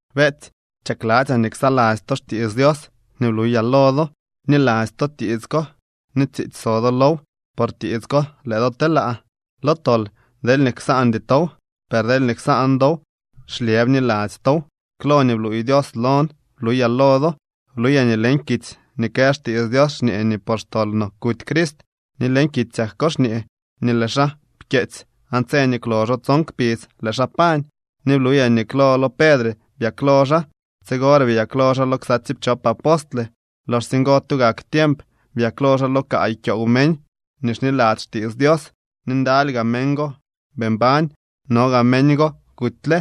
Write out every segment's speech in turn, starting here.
Beetsy, chakladzyaa nii ksaladzy to xtiits Dios nii bluyaa lo do. Bniladzy to tiits ko ni tsiitsy so do low. Por tiits ko lëë do telaa lo tol deelñee ksaandy tow, per deelñee ksaan dow xlyë bniladzy tow. Klo nii bluuy Dios lon bluyaa lo do. Bluyaa nii leñ kitsy nii kë xtiits Dios xñee nii por xtol no kuty Crist, ni leñ kitsyak ko xñee nii lëë xaa pkyeetsy aan tse nii kwloxo tson kpidz lëë xaa pañ. Ni bluyaa nii klo lo Pedre byaklo xaa, tsigore byaklo xaa lo ksa tsiipchop apostle. Loxsye ngo tugak tiemp byaklo xaa lo kaay kyoow meñ nii xniladzy xtiits Dios, ni ndaly gaa meñ go bii mbañ, no gaa meñ go kutyle.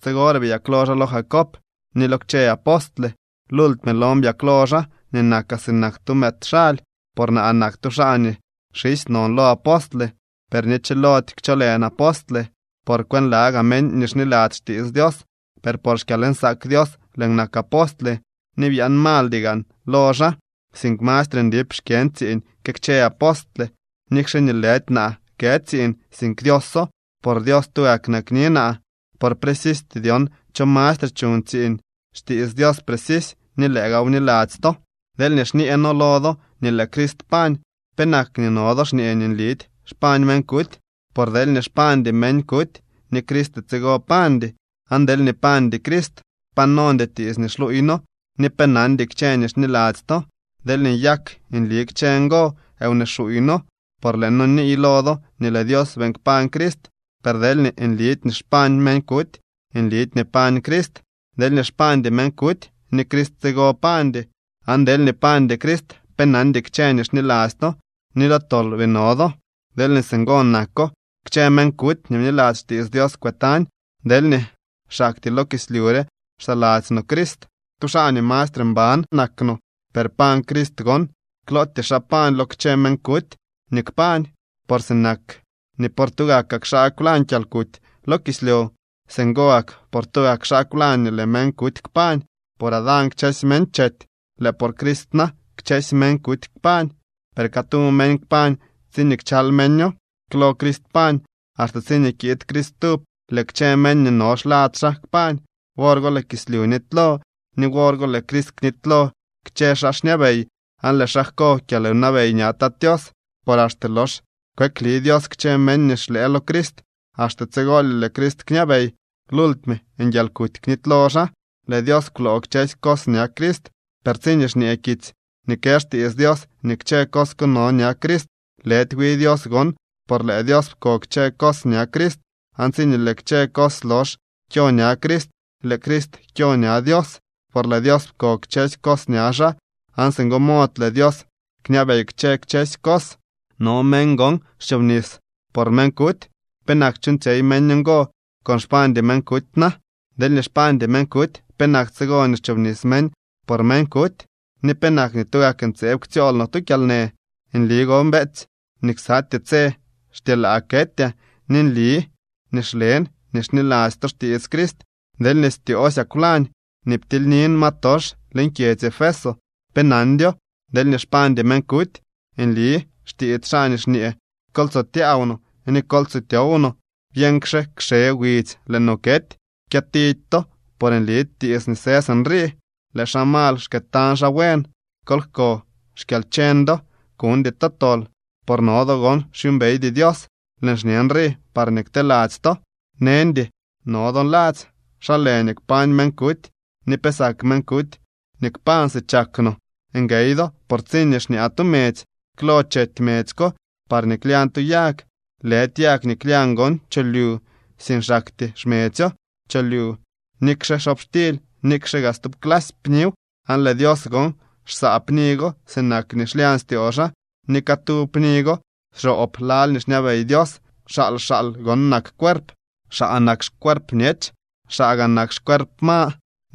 Tsigore byaklo xaa lo Jacob, ni lo kchë apostle. Lultime lon byaklo xaa nii nakaa sinak tu mëëd xaly. Por naa nak tu xaa nii xisy non lo apostle, per ni chilody kcholën apostle, por kwënlagaa meñ nii xniladzy xtiits Dios. Per por xkyalnsaak Dios lëën nak apostle. Ni byaan maaldy gaan lo xaa, sink mastre ndip xkyën tsiiñ que kchë apostle, nikxe nii lëdy naa kë tsiiñ, sink Dioso. Por Dios tugak nakni naa. Por precisty dyon cho mastre chuñ tsiiñ, xtiits Dios precisy ni lëë gaaw bniladzy to. Deelñee xñee noo lo do nii lëë Crist pañ, ¿penak nii no do xñee nii nlidy xpañ meñ kuty? Por deelñee xpañdy meñ kuty, ni Crist tsigo pañdy. Aan deelñee pañdy Crist, pa nondy tiits nii xluuy noo, ni pe nandy kchë nii xniladzy to. Deelñee nyak nli kchë ngo, wnee xuuy noo, por lëë noo niiy lo do nii lëë Dios beeñ kpañ Crist. Per deelñee nlidy nii xpañ meñ kuty, nlidy nii pañ Crist. Deelñee xpañdy meñ kuty, ni Crist tsigo pañdy. Aan deelñee pañdy Crist, pe nandy kchë nii xniladzy to, ni lo tol bii no do. Deelñee singo nako, kchë meñ kuty nii bniladzy xtiits Dios kwëtañ. Deelñee xaktyee lo kislyu re xsaladzy no Crist, tu xaa nii mastre mban nak no. Per pañ Crist gon. Klootyee xaa pañ lo kchë meñ kuty nii kpañ. Por sinak nii por tugak xaa kwlañ kyalkuty lo kislyu, singo gak por tugak xaa kwlañ nii lëë meñ kuty kpañ. Por Adán kchësy meñ chety. Lëë por Crist na, kchësy meñ kuty kpañ. Per catu meñ kpañ tsiñee kchal meño. Klo Crist pañ. Axte tsiñee kiid Crist stub, lëë kchë meñ nii no xlad xaa kpañ. Wor go lëë kislyu nitylo, ni wor go lëë Crist knitylo kchë xaa xñabey aan lëë xaa jko kyalwnabey ña Tat Tios. Por axte lox kweekli Dios kchë meñ nii xlëë lo Crist, axte tsigolye lëë Crist kñabey. Lultime nguialkuty knitylo xaa. Lëë Dios kwloo kchësy cos ña Crist. Per tsiñee xñee kitsy nii kë xtiits Dios nii kchë cos no ña Crist, lëdy wi Dios gon, por lëë Dios pko kchë cos ña Crist. Aan tsiñee lëë kchë cos lox kyo ña Crist, lëë Crist kyo ña Dios, por lëë Dios pko kchësy cos ña xaa. Aan singo mod lëë Dios kñabey kchë kchësy cos. No meñ gon xchoobnis por meñ kuty. ¿Penak chuuñtsyey meñ ngo con xpañdy meñ kuty na? Deelñee xpañdy meñ kuty, ¿penak tsigo nii xchobnis meñ por meñ kuty? ¿Ni penak nii tugak ntseeb ktsyool noo tu kyalnë? Nli gon, beetsy, nii ksatyee tse xtyelaa ketyaa, ni nli nii xlen nii xniladzy to xtiits Crist. Deelñee styoosyaa kwlañ nii ptilynin ma tox leñ kyedzy Efeso, pe nandyo. Deelñee xpañdy meñ kuty, nli xtiits xaa nii xñee: “Kol tso tyaaw no ni kol tso tyow no. Byeñxke kxe widzy lëë no kety.” Kyëtidy to, por nli tiits nii së sinrii: “Lëë xaa mal xkëëtañ xaa buen.” Kol jko xkyalcheñ do, kuñdy to tol, por no do gon xyuumbeydy Dios. Lëën xñe nrii parñee kteladzy to. Neñdy no do nladzy: “¿Xa lë nii kpañ meñ kuty ni pe sak meñ kuty nii kpañ si chak no?” Nguey do, por tsiñee xñaa tu medzy, klo chety medzy ko parñee klyañ tu yag. Lëdy yag nii klyañ gon cholyu, sink xaktyee xmedzyo cholyu, nikxe xobxtily, nikxe gaa stub clasy pniw. Aan lëë Dios gon xsaa pni go sinak nii xlyañ styoo xaa, ni catu pni go xroob lal nii xñabey Dios. Xaal xaal gon nak cuerp. Xaa nak xcuerp bñech, xaa gaa nak xcuerp ma,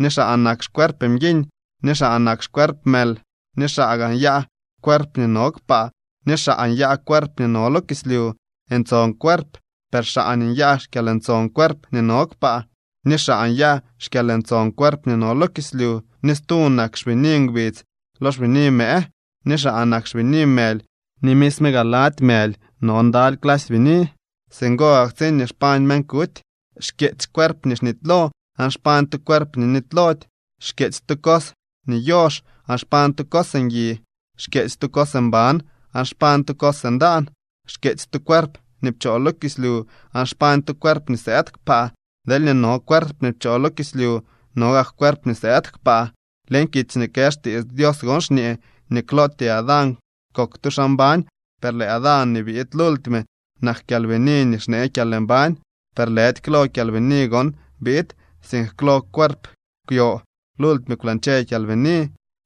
ni xaa nak xcuerp mguiñ, ni xaa nak xcuerp mël. Ni xaa gaa nyaa cuerp nii no kpaa, ni xaa nyaa cuerp nii no lo kislyu. Ntson cuerp, per xaa nyaa xkyalntson cuerp nii no kpaa, ni xaa nyaa xkyalntson cuerp nii no lo kislyu. Ni stu nak xbini ngbidz lo xbini mëë, ni xaa nak xbini mëly ni misme gaa lady mëly no ndaly clasy bini. Singo gak tsiñee xpañ meñ kuty. Xkyeetsy cuerp nii xnitylo, aan xpañ tu cuerp nii nitylody. Xkyeetsy tu cos nii yox, aan xpañ tu cos ngui. Xkyeetsy tu cos mban, aan xpañ tu cos ndaan. Xkyeetsy tu cuerp nii pchoo lo kislyu, aan xpañ tu cuerp nii sëëd kpaa. Deelñee no cuerp nii pchoo lo kislyu, no gak cuerp nii sëëd kpaa. Leñ kitsy nii kë xtiits Dios gon xñee nii klootyee Adán kok tu xaa mbañ, per lëë Adán nii biid lultime nak kyalbini nii xnee kyalmbañ. Per lëdy klo kyalbini gon biid, sink klo cuerp kwyo. Lultime kwlañche kyalbini.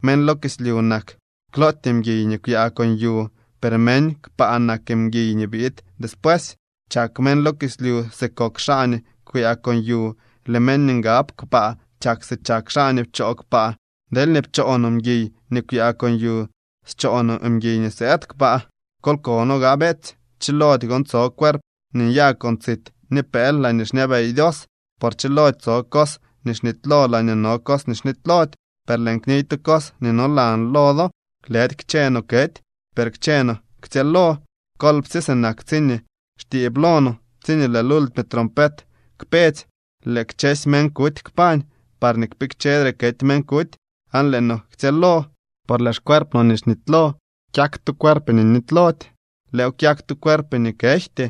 Meñ lo kislyu nak klootyee mguiy nii kwyaa con yu, per meñ kpaa nak mguiy nii biid despuesy. Chak meñ lo kislyu si kok xaa nii kwyaa con yu. Lëë meñ nii ngab kaa kpaa chak si chak xaa nii pchoo kpaa. Deelñee pcho no mguiy nii kwyaa con yu, scho no mguiy nii sëëd kpaa. Kol kono gaa, beetsy. Chilody gon tso cuerp nii nyaa con tsit ni pëël laañee xñabey Dios, por chilody tso cos nii xnitylo laañee no cos nii xnitylody. Per lëën kniy tu cos nii nolan lo do. Lëdy kchë no kety, per kchë no ktsyëëlo. Kolpsye, sinak tsiñee xtiib lo no, tsiñee lëë lultime trompet kpetsy, lëë kchësy meñ kuty kpañ parñee kpikchedre kety meñ kuty. Aan lëë no ktsyëëlo. Por lëë xcuerp no nii xnitylo kyak tu cuerp nii nitylody. Lëëw kyak tu cuerp nii kejty.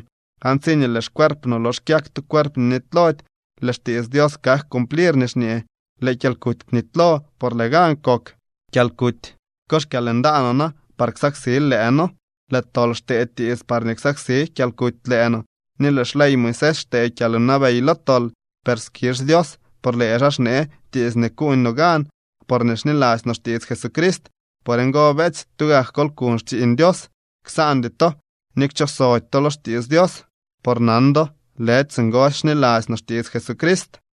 Aan tsiñee lëë xcuerp no lox kyak tu cuerp nii nitylody, lëë xtiits Dios kak cumplir nii xñee: “Lëë kyalkuty kwnitylo por lëë gan kok.” Kyalkuty, ¿ko xkyalndaanoo na par ksaksil lëë noo? Lëë tol xtee tiits parñee ksaksi kyalkuty lëë no, ni lëë xley Moisés xtee kyalwnabey lo tol. Per skizh Dios, por lëë xaa xnee tiits nii kuuñ no gan, porñee xniladzy no xtiits Jesucrist. Por ngo, beetsy, tugak kol kuñ xtsiiñ Dios. Ksaandy to ni kchooxsody to lo xtiits Dios, por nan do lëdy singosy xniladzy to xtiits Jesucrist.